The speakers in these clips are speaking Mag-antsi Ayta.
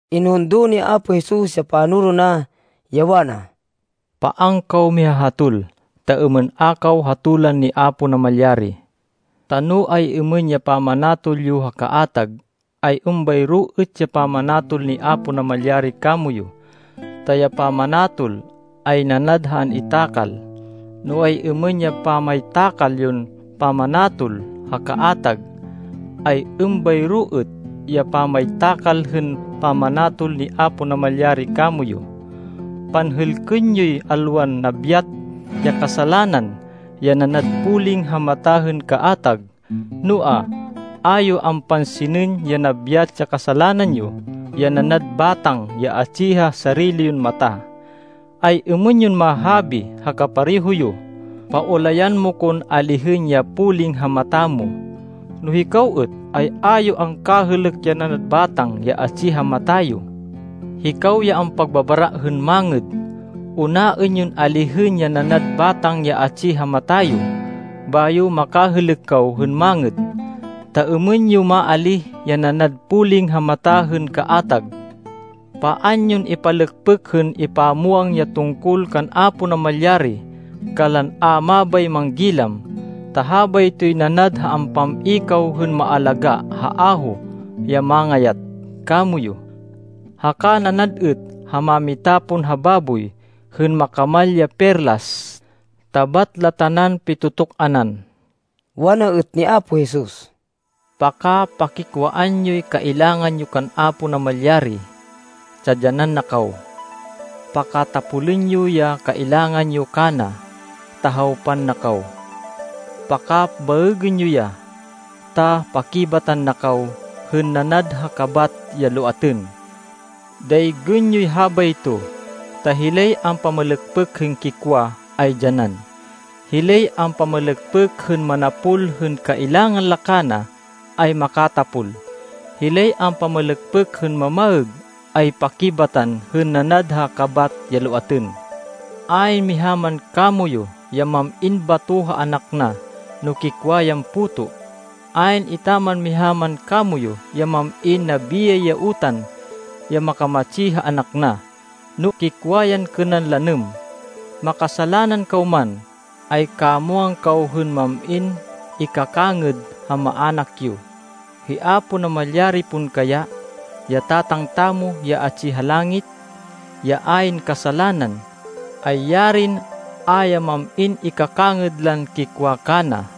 Inhundo ni Apo Jesus ya panoro na, ya wana, “Paan kaw mihahatol, ta êmên a kaw hatolan ni Apo Namalyari. Ta no ay-êmên ya pamanatol yo ha kaatag, ay êmbayro êt ya pamanatol ni Apo Namalyari kamoyu. Ta ya pamanatol ay nanad ha an-itakal. No ay-êmên ya pamaytakal yon pamanatol ha kaatag, ay êmbayro êt ya pamaytakal hên pamanatol ni Apo Namalyari kamoyu. Panhêlkên yoy alwan nabyat ya kasalanan ya nanad poling ha mata hên kaatag, noa, a yo ampansinên ya nabyat ya kasalanan yo, ya nanad batang ya atsi ha sarili yon mata. Ay-êmên yon mahabi ha kapareho yo, ‘Paulayan mo kon alihên ya poling ha mata mo,’ no hikaw êt, ay a yo angkahêlêk ya nanad batang ya atsi ha mata yo. Hikaw ya ampagbabara hên mangêd! Unaên yon alihên ya nanad batang ya atsi ha mata yo, bayo makahêlêk kaw hên mangêd, ta êmên yo maalíh ya nanad poling ha mata hên kaatag. “Paan yon ipalêkpêk hên ipamwang ya tungkol kan Apo Namalyari kanlan a mabay manggilam, ta habaytoy nanad ha ampam-i kaw hên maalagá ha aho ya mangayat kamoyu. Haka nanad êt ha mamitapon ha baboy, hên makamal ya perlas, ta bat la tanan pitu-tuk-anan.” Wana êt ni Apo Jesus, “Paka-pakikwaan yoy kailangan yo kan Apo Namalyari, ta dyanan na kaw. Pakatapolên yo ya kailangan yo kana, ta hawpan na kaw. Pakabaêgên yo ya, ta pakibatan na kaw hên nanad ha kabat ya loatên. Daygên yoy habayto, ta hilay ampamalêkpêk hên kikwa ay dyanan. Hilay ampamalêkpêk hên manapol hên kailangan la kana ay makatapol. Hilay ampamalêkpêk hên mamaêg, ay pakibatan hên nanad ha kabat ya loatên. Ayn miha man kamoyu ya mam-in bato ha anak na, no kikwa yan puto. Ayn etaman miha man kamoyu ya mam-in nabiyay ya utan ya makamatsi ha anak na, no kikwa yan kênan lanêm. Makasalanan kaw man, ay kamwang kaw hên mam-in ikakangêd ha maának yo. Hi Apo Namalyari pon kaya, ya Tatang tamo ya atsi ha langit, ya ayn kasalanan, ay yarin a ya mam-in ikakangêd lan kikwa kana!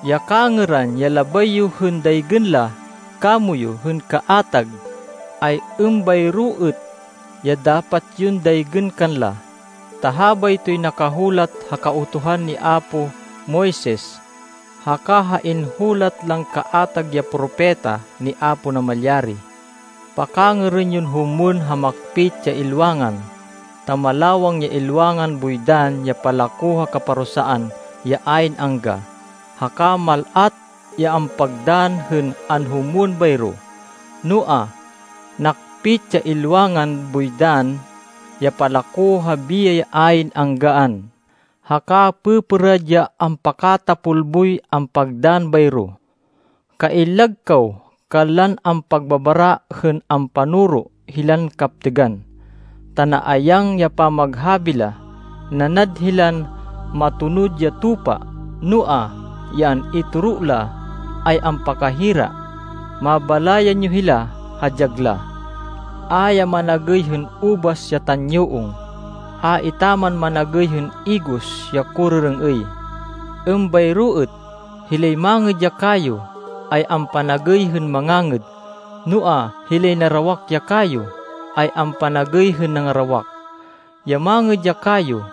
“Ya kangêran ya labay yo hên daygên la kamoyu hên kaatag, ay êmbayro êt ya dapat yon daygên kanla, ta habaytoy nakahulat ha Kautuhan ni apo Moises, haka ha inhulat lan kaatag ya propeta ni Apo Namalyari.” “Pakangêrên yon humwên ha makpit ya ilwangan, ta malawang ya ilwangan boy dann ya palako ha kaparusaan ya ayn angga, haka mal-at ya ampagdann hên anhumwên bayro. Noa, nakpit ya ilwangan boy dann ya palako ha biyay ya ayn anggaan, haka pêpêrad ya ampakatapol boy ampagdann bayro.” “Kaillag kaw kanlan ampagbabara hên ampanoro hilan kaptêgan, ta naayang ya pamaghabi la. Nanad hilan matonud ya tupa, noa, ya an-itoro la ay ampakahira. Mabalayan yo hila ha dyag la. A ya managêy hên ubas ya tanyuong! A etaman managêy hên igos ya korêrêng-êy! Êmbayro êt, hilay mangêd ya kayo, ay ampanagêy hên mangangêd, noa hilay narawak ya kayo, ay ampanagêy hên nangarawak. Ya mangêd ya kayo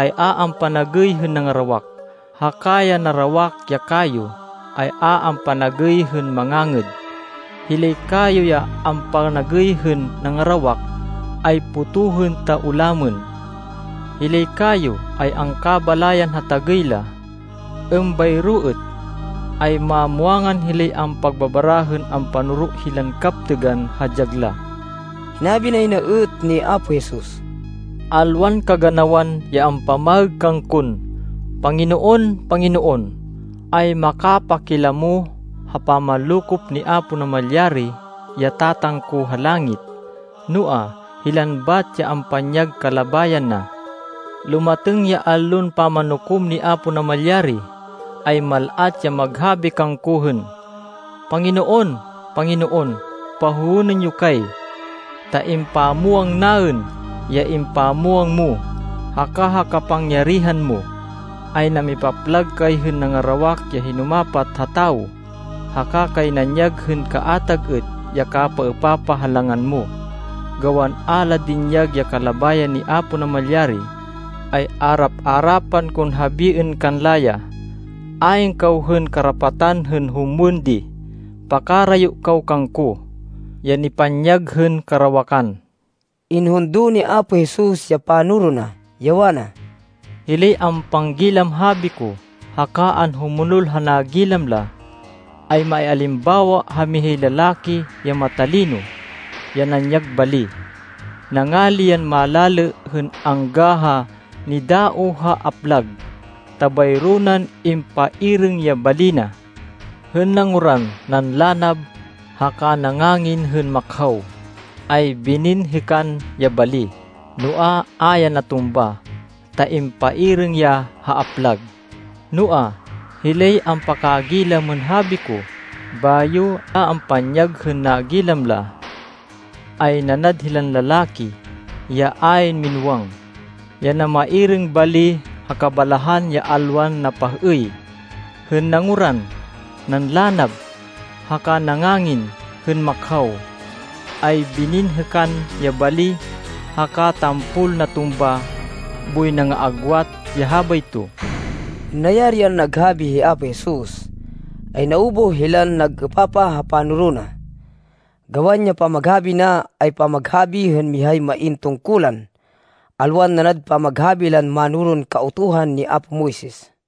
ay a ampanagêy hên nangarawak, haka ya narawak ya kayo ay a ampanagêy hên mangangêd. Hilay kayo ya ampanagêy hên nangarawak ay potohên ta ulamên. Hilay kayo ay angkabalayan ha tagêy la. Êmbayro êt, ay mamwangan hilay ampagbabara hên ampanoro hilan kaptêgan ha dyag la.” Hinabi nay na êt ni Apo Jesus, “Alwan kaganawan ya ampamaêg kangkon, ‘Panginoon, Panginoon,’ ay makapakilamo ha pamanlokop ni Apo Namalyari, ya Tatang ko ha langit, noa, hilan bat ya ampanyag kalabayan na. Lumatêng ya Allon Pamanukom ni Apo Namalyari, ay mal-at ya maghabi kangko hên, ‘Panginoon, Panginoon, pahowênên yo kay! Ta impamwang naên ya impamwang mo, haka ha kapangyarihan mo, ay namipaplag kay hên nangarawak ya hinumapat ha tawo, haka kay nanyag hên kaatag êt ya kapapaêpapah ha langan mo.’ Gawan a la dinyag ya kalabayan ni Apo Namalyari, ay arap-arapan kon habiên kanla ya, ‘Ayn kaw hên karapatan hên humwên di! Pakarayo kaw kangko, ya nipanyag hên karawakan!’” Inhundo ni Apo Jesus ya panoro na, ya wana, “Hilay ampanggilam habi ko, haka anhumonol ha nagilam la, ay maialimbawa ha mihay lalaki ya matalino, ya nanyag bali. Nangali yan malalê hên angga ha nidaoh ha aplag, ta bayro nan impairêng ya bali na. Hên nanguran, nanlanab, haka nangangin hên makhaw, ay bininhêkan ya bali, noa, a ya natumba, ta impairêng ya ha aplag. Noa, hilay ampakagilam hên habi ko, bayo a ampanyag hên nagilam la, ay nanad hên lalaki, ya ayn minúwang, ya namairêng bali ha kabalahan ya alwan napah-êy. Hên nanguran, nanlanab, haka nangangin hên makhaw, ay bininhêkan ya bali, haka tampol natumba boy nangaagwat ya habayto.” Hên nayari yan naghabi hi Apo Jesus, ay naubuh hilan nag-êpapah ha panoro na, gawan ya pamaghabi na, ay pamaghabi hên mihay main tungkulan, alwan nanad pamaghabi lan mánoron Kautuhan ni apo Moises.